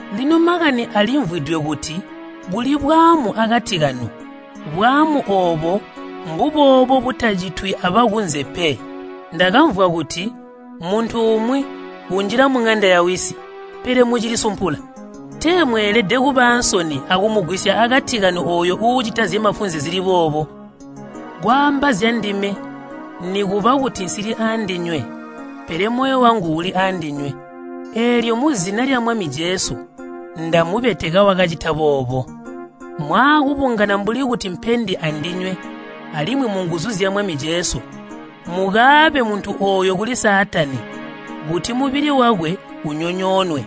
Lino makani alimvwidwe kuti kuli bwaamu akati kanu. Bwaamu oobo mbuboobo butacitwi abakunze pe. Ndakamvwa kuti muntu umwi unjila muŋanda yawisi. Pele mucilisumpula! Tee mweelede kuba aansoni akumugwisya akati kanu ooyo uucita zyamafunze zili boobo! Kwaamba zyandime nikuba kuti nsili aandinywe, pele moyo wangu uli aandinywe. Eelyo muzina lya Mwami Jesu ndamubeteka wakacita boobo. Mwaakubungana mbuli kuti mpendi andinywe alimwi munguzu zya Mwami Jesu, mukaabe muntu ooyo kuli Saatani kuti mubili wakwe unyonyoonwe,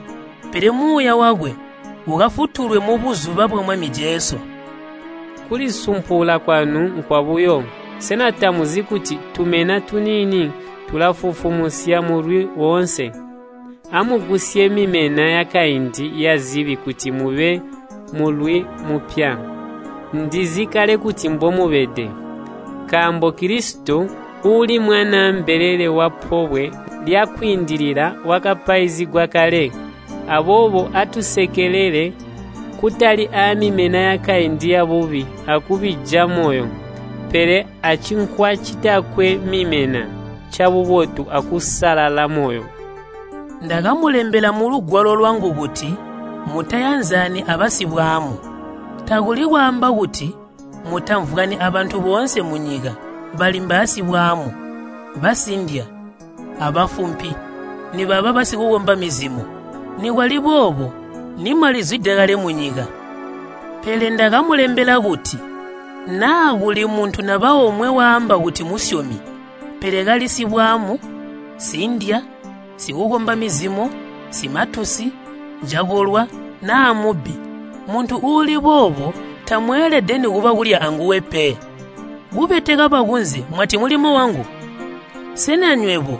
pele muuya wakwe ukafutulwe mubuzuba bwa Mwami Jesu. Kulisumpula kwanu nkwabuyo. Sena tamuzi kuti, “Tumena tuniini tulafufumusya mulwi woonse?” Amugwisye mimena yakaindi yazibi kuti mube mulwi mupya, ndizi kale kuti mbomubede. Nkaambo Kilisito, uuli mwanaa mbelele wa Pobwe lya Kwiindilila wakapaizigwa kale. Aboobo atusekelele, kutali aamimena yakaindi yabubi akubija moyo, pele acinkwa citakwe mimena, cabubotu akusalala moyo. Ndakamulembela mulugwalo lwangu kuti mutayanzani abasibwaamu. Takuli kwaamba kuti mutamvwani abantu boonse munyika bali mbaasibwaamu, basindya abafumpi nibaba basikukomba mizimo. Nikwali boobo nimwalizwide kale munyika. Pele ndakamulembela kuti naa kuli muntu naba omwe waamba kuti musyomi, pele kali sibwaamu, sindya, sikukomba mizimo, simatusi, cakolwa, naa mubbi, muntu uuli boobo tamweelede nikuba kulya anguwe pe. Kubeteka bakunze mwati mulimo wangu? Sena nywebo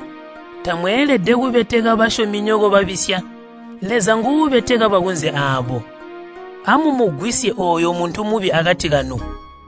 tamweelede kubeteka basyominyoko babisya? Leza nguubeteka bakunze aabo. “Amumugwisye ooyo muntu mubi akati kanu.”